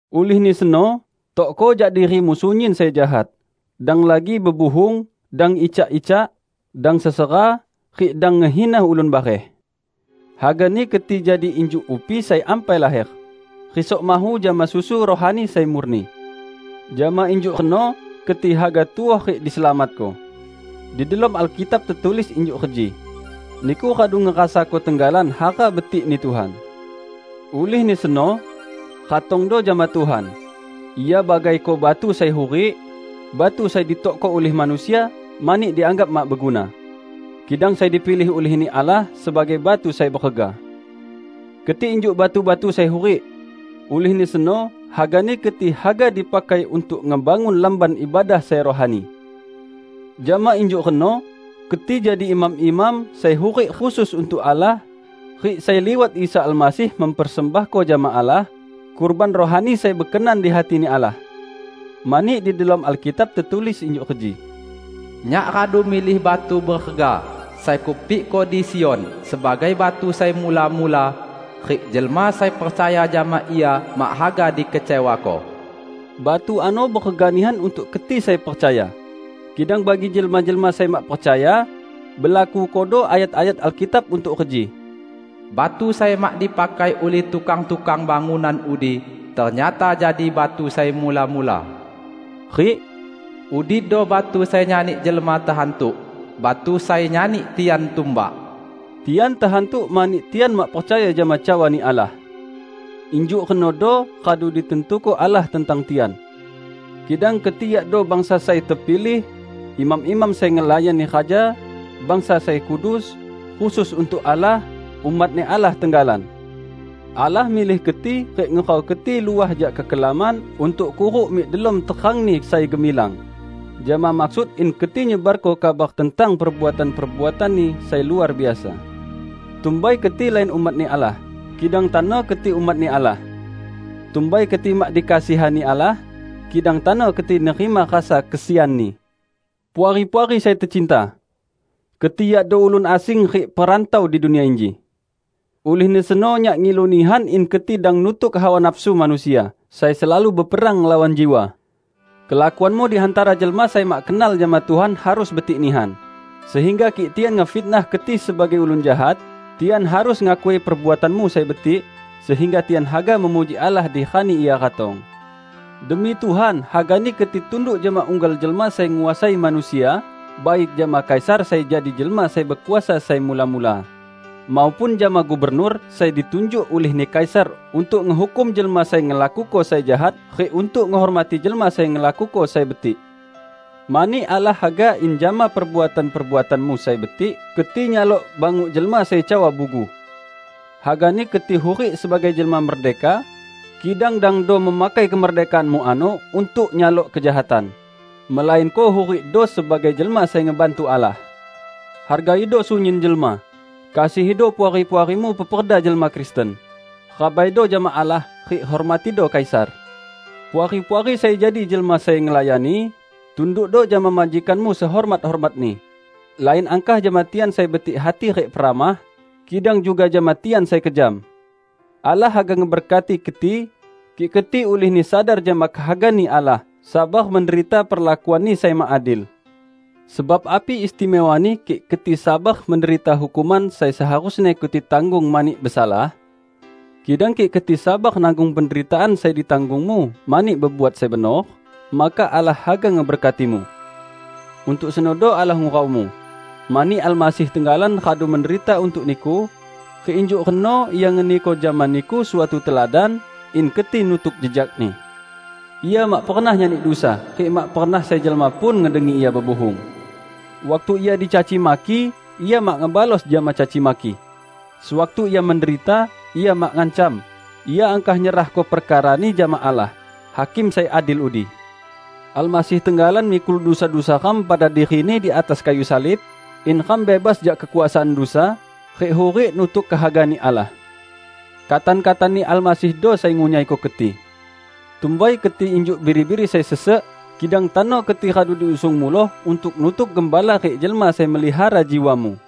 Ulihni seno, tokko jak dirimu sunyin sai jahat; dang lagi bebuhung, dang icak-icak. Dang sesera, rik dang ngehina ulun bareh. Hagani keti jadi injuk upi sai ampai laher, risok mahu jama susu rohani sai murni. Jama injuk reno keti haga tuoh rik diselamatko. Di delom Alkitab tetulis injuk reji, "Niku radu ngerasako tenggalan hara betikni Tuhan." Ulihni seno, ratongdo jama Tuhan. Ia bagaiko batu sai hurik, batu sai ditokko ulih manusia mani dianggap mak beguna; kidang sai dipilih ulih-Ni Allah sebagai batu sai berega. Keti injuk batu-batu sai hurik. Ulihni seno hagani keti haga dipakai untuk ngebangun Lamban Ibadah sai rohani. Jama injuk reno keti jadi imam-imam, sai hurik khusus untuk Allah, rik sai liwat Isa Almasih mempersembahko jama Allah, kurban rohani sai bekenan di hati-Ni Allah. Mani di delom Alkitab tetulis injuk reji, "Nyak radu milih batu berega, sai Kupikko di Sion sebagai batu sai mula-mula; rik jelma sai percaya jama Ia mak haga dikecewako." Batu ano berega nihan untuk keti sai percaya. Kidang bagi jelma-jelma sai mak percaya, belakukodo ayat-ayat Alkitab untuk reji, "Batu sai mak dipakai ulih tukang-tukang bangunan udi ternyata jadi batu sai mula-mula," rik "Udido batu sai nyani jelma tehantuk, batu sai nyani tian tumbak." Tian tehantuk mani tian mak percaya jama cawa-Ni Allah. Injuk renodo radu ditantuko Allah tentang tian. Kidang keti yakdo bangsa sai tepilih, imam-imam sai ngelayani raja, bangsa sai kudus, khusus untuk Allah, umat-Ni Allah tenggalan. Allah milih keti rik ngurau keti luah jak kekelaman untuk kuruk mik delom terang-Ni sai gemilang, jama maksud in keti nyebarko kabar tentang perbuatan-perbuatan-Ni sai luar biasa. Tumbai keti lain umat-Ni Allah, kidang tano keti umat-Ni Allah. Tumbai keti mak dikasihani Allah, kidang tano keti nerima rasa kesian-Ni. Puari-puari sai tecinta! Keti yakdo ulun asing rik perantau di dunia inji. Ulihni seno nyak ngilu nihan in keti dang nutuk hawa nafsu manusia sai selalu beperang ngelawan jiwa. Kelakuanmu di hantara jelma sai mak kenal jama Tuhan harus betik nihan, sehingga kik tian ngefitnah keti sebagai ulun jahat, tian harus ngakui perbuatanmu sai betik, sehingga tian haga memuji Allah di rani Ia ratong. Demi Tuhan, hagani keti tunduk jama unggal jelma sai nguasai manusia: baik jama Kaisar sai jadi jelma sai bekuasa sai mula-mula, maupun jama gubernur sai ditunjuk ulihni Kaisar untuk ngehukum jelma sai ngelakuko sai jahat rik untuk ngehormati jelma sai ngelakuko sai betik. Mani Allah haga in jama perbuatan-perbuatanmu sai betik keti nyalok banguk jelma sai cawa bugu. Hagani keti hurik sebagai jelma merdeka, kidang dangdo memakai kemerdekaanmu ano untuk nyalok kejahatan, melainko hurikdo sebagai jelma sai ngebantu Allah. Hargaido sunyin jelma, kasihido puari-puarimu peperda jelma Kristen. Rabaido jama Allah, rik hormatido Kaisar. Puari-puari sai jadi jelma sai ngelayani, tundukdo jama majikanmu sehormat-hormatni; lain angkah jama tian sai betik hati rik peramah, kidang juga jama tian sai kejam. Allah haga ngeberkati keti, kik keti ulihni sadar jama kehaga-Ni Allah, sabar menderita perlakuanni sai mak adil. Sebab api istimewani kik keti sabar menderita hukuman sai seharusni keti tanggung mani besalah? Kidang kik keti sabar nanggung penderitaan sai ditanggungmu mani bebuat sai benor, maka Allah haga ngeberkatimu. Untuk senodo Allah nguraumu. Mani Almasih tenggalan radu menderita untuk niku, rik injuk reno Ia ngeniko jama niku suatu teladan, in keti nutuk jejak-Ni. Ia mak pernah nyani dusa, rik mak pernah sai jelma pun ngedengi Ia bebuhung. Waktu Ia dicaci maki, Ia mak ngebalos jama caci maki. Sewaktu Ia menderita, Ia mak ngancam; Ia angkah nyerahko perkara-Ni jama Allah, Hakim sai adil udi. Almasih tenggalan mikul dusa-dusa ram pada diri-Ni di atas kayu salib, in ram bebas jak kekuasaan dusa, rik hurik nutuk kehaga-Ni Allah. Katan-katan-Ni Almasihdo sai ngunyaiko keti. Tumbai keti injuk biri-biri sai sesek, kidang tano keti radu diusung muloh untuk nutuk Gembala rik Jelma Sai Melihara jiwamu.